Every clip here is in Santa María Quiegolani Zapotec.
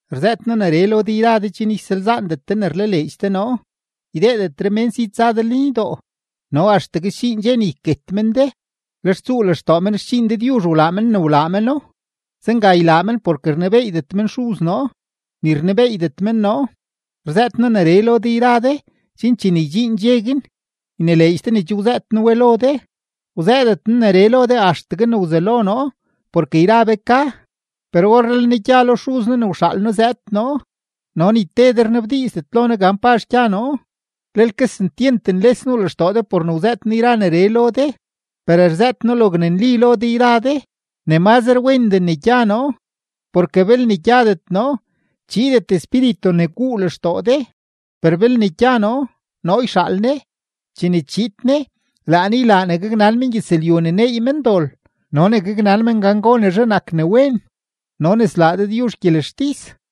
’Rzëët noo neree lo de yra de chen ysalzaandet de ne rlaleedx de noo. Ydeedetre mén si tsa de lenydoo, no axtegue sdxiin dxe ne yket men de, lex tsuu lextoo men xdxiin Dëdyuzh wlaa men ne wlaa meno. Zenga ylaa men porke rnebeeydet men Xuz noo, ni rnebeeydet men noo. Rzëët noo neree lo de yra de, chen chene ydxiin dxe guin, ynileedx de ne che wzëët noo we lo de. ’Wzëëdet noo neree lo de axtegue ne wzelo noo porke yra be ka. Per orree le noo gya lo Xuz noo ne wxaal noo zëëd noo, no ni te de rnabdiizdet lo noo gan pazh gya noo. Lel kesentyent nles nuu lextoo de por ne wzëët noo yra neree lo de. Per rzëët noo logne nli lo de yra de, ne mazre wendee ne gya noo. Porke belne gyadet noo, chiidet Espíritu ne guu lextoo de; per belne gya noo, noo yxaal Ne. Chene chiid Ne, laa Ne ylaa ne gaknan mengyëzlyu ne neey men dol no ne gaknan men gan gonezhe nak ne wen no ne slaa Dëdyuzh gyelextis.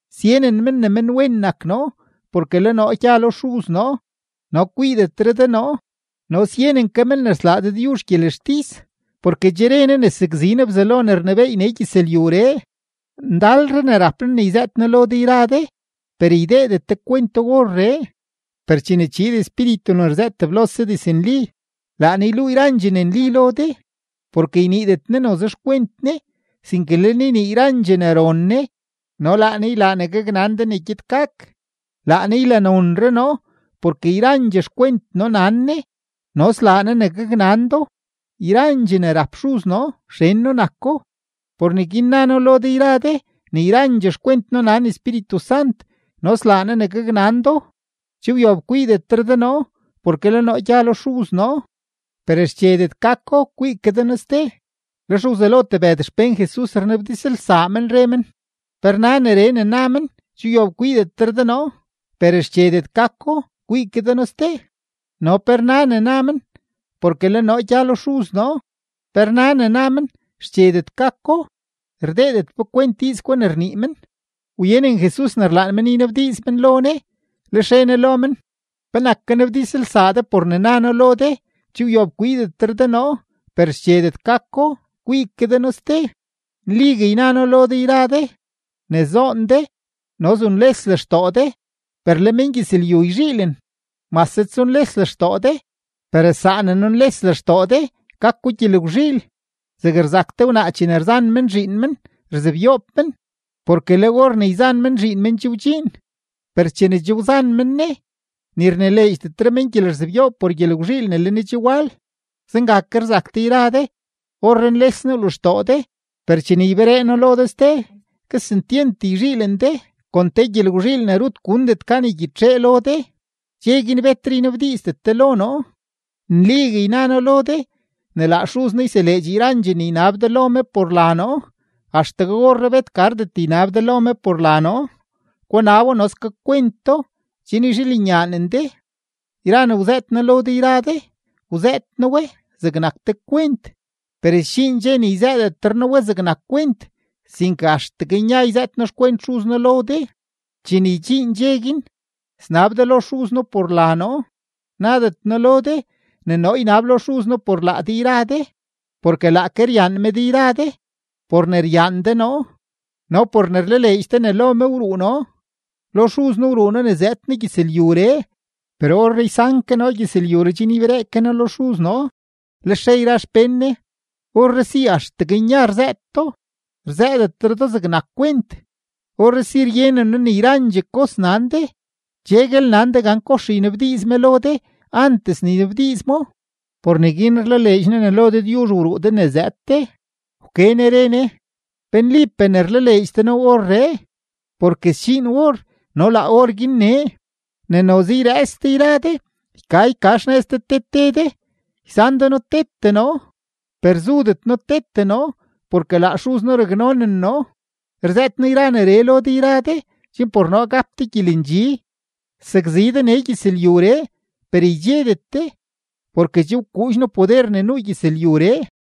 Syenen men ne menwen nak noo porke le noo gya lo Xuz noo no kwiidetre de noo, no syenen ke men ne slaa Dëdyuzh gyelextis porke che re Ne ne sakzi Ne Bzelo ne rnebééy nee gyëzlyuree. ’Ndalre ne rap noo ne yzëët noo lo de yra de, per ydeedet de kwento orree. Per chene chiid Espíritu ne rzëët teblose diznli, laa Ne yluu yrandxee ne nli lo de, porke yniidet Ne noze xkwent Ne, sinke le Ne ynii yrandxee ne ron Ne no laa Ne ylaa ne gaknan de ne gyed gak. Laa Ne ylanonre noo porke yrandxee xkwent noo nan Ne no slaa Ne ne gaknan do. Yrandxee ne rap Xuz noo, xen noo nako. Por neguin na noo lo de yra de ne yrandxee xkwent noo nan Espíritu Sant no slaa Ne ne gaknan do. ’Che wyob kwiidetre de noo porke le noo gya lo Xuz noo, per xchedet gako kwii ke de noo ste. Lex wzelo tebëd xpén Jesus rnabdizlsaa men, re men: ―¿Pe rna neree ne na men: “Che wyob kwiidetre de noo, per xchedet gako kwii ke de noo ste”? No ¿pe rna ne na men: “Porke le noo gya lo Xuz noo”? ¿Pe rna ne na men: “xchedet gako”? Rdeedet be kwent diiz gwa ne rnii men. Wyenen Jesus ne rlaan men ynabdiiz men lo Ne, lex re Ne lo men: ―¿Penak kanabdizlsaa de por ne na noo lo de: “Che wyob kwiidetre de noo, per xchedet gako kwii ke de noo ste”? Nligue yna noo lo de yra de, ne zoon de no zunles lextoo de, per le mengyëzlyu yzhiilen. Mase tsunles lextoo de, per saa ne nunles lextoo de, gako gyelgwzhiil. Zeg rzak te wnaa chene yzan men zhiin men, rzebyoob men porke le or ne yzan men zhiin men che wdxiin, per chene che wzan men ne, ni rnileedxdetre men gyelerzebyoob por gyelgwzhiil ne le ne che wal; zenga ke rzak de yra de. Orree nles nuu lextoo de, per chene yberee noo lo de ste, kesentyent yzhiilen de kon te gyelgwzhiil ne rut gundet gan ygyitxee lo de. ’Dxe guin betre ynabdiizdet de lo noo. Nligue yna noo lo de ne laa Xuz noo yseleedx yrandxee ne ynab de lo me por la noo. Axtegue orree bet gardet ynab de lo me por la noo; gunabo no skakwento, chen yzhiilenyaanen de. ’Yra ne wzëët noo lo de yra de, wzëët noo we zegnak te kwent; per sdxiin dxe ne yzëëdetre noo we zegnak kwent, sinke axtegue nya yzëët noo xkwent Xuz noo lo de. Chene ydxiin dxe guin, snab de lo Xuz noo por la noo; nadet noo lo de ne noo ynab lo Xuz noo por laa de yra de, porke laake ryaan me de yra de, por ne ryaan de noo no por ne rlaleedx de ne lo me wruu noo. Lo Xuz noo wruu noo ne zëëd noo gyëzlyuree, per orree ysan ke noo gyëzlyuree chen yberee ke noo lo Xuz noo. Lex re yra xpén Jesus: ―Orree si axtegue nya rzëët do, rzëëdetre do zegnak kwent. Orree si ryenen noo ne yrandxee kos nan de, cheguel nan de gan kox ynabdiiz me lo de antes ne ynabdiiz mo. Por neguin rlaleedx noo ne lo Dëdyuzh wruu de ne zëëd de. Wke Ne re Ne: ―¿Pe nlipee ne rlaleedx de noo orree? Porke sdxiin or no laa orguin nee, ne noze yrëëts de yra de yka yka xnëz de te te de, ysan de noo tete noo. Per zudet noo tete noo porke laa Xuz noo raknonen noo. Rzëët noo yra neree lo de yra de chen por noo gap de gyelendxi. Sakzi de nee gyëzlyuree, per ydxedet de, porke che wkuudx noo poder ne nuu gyëzlyuree.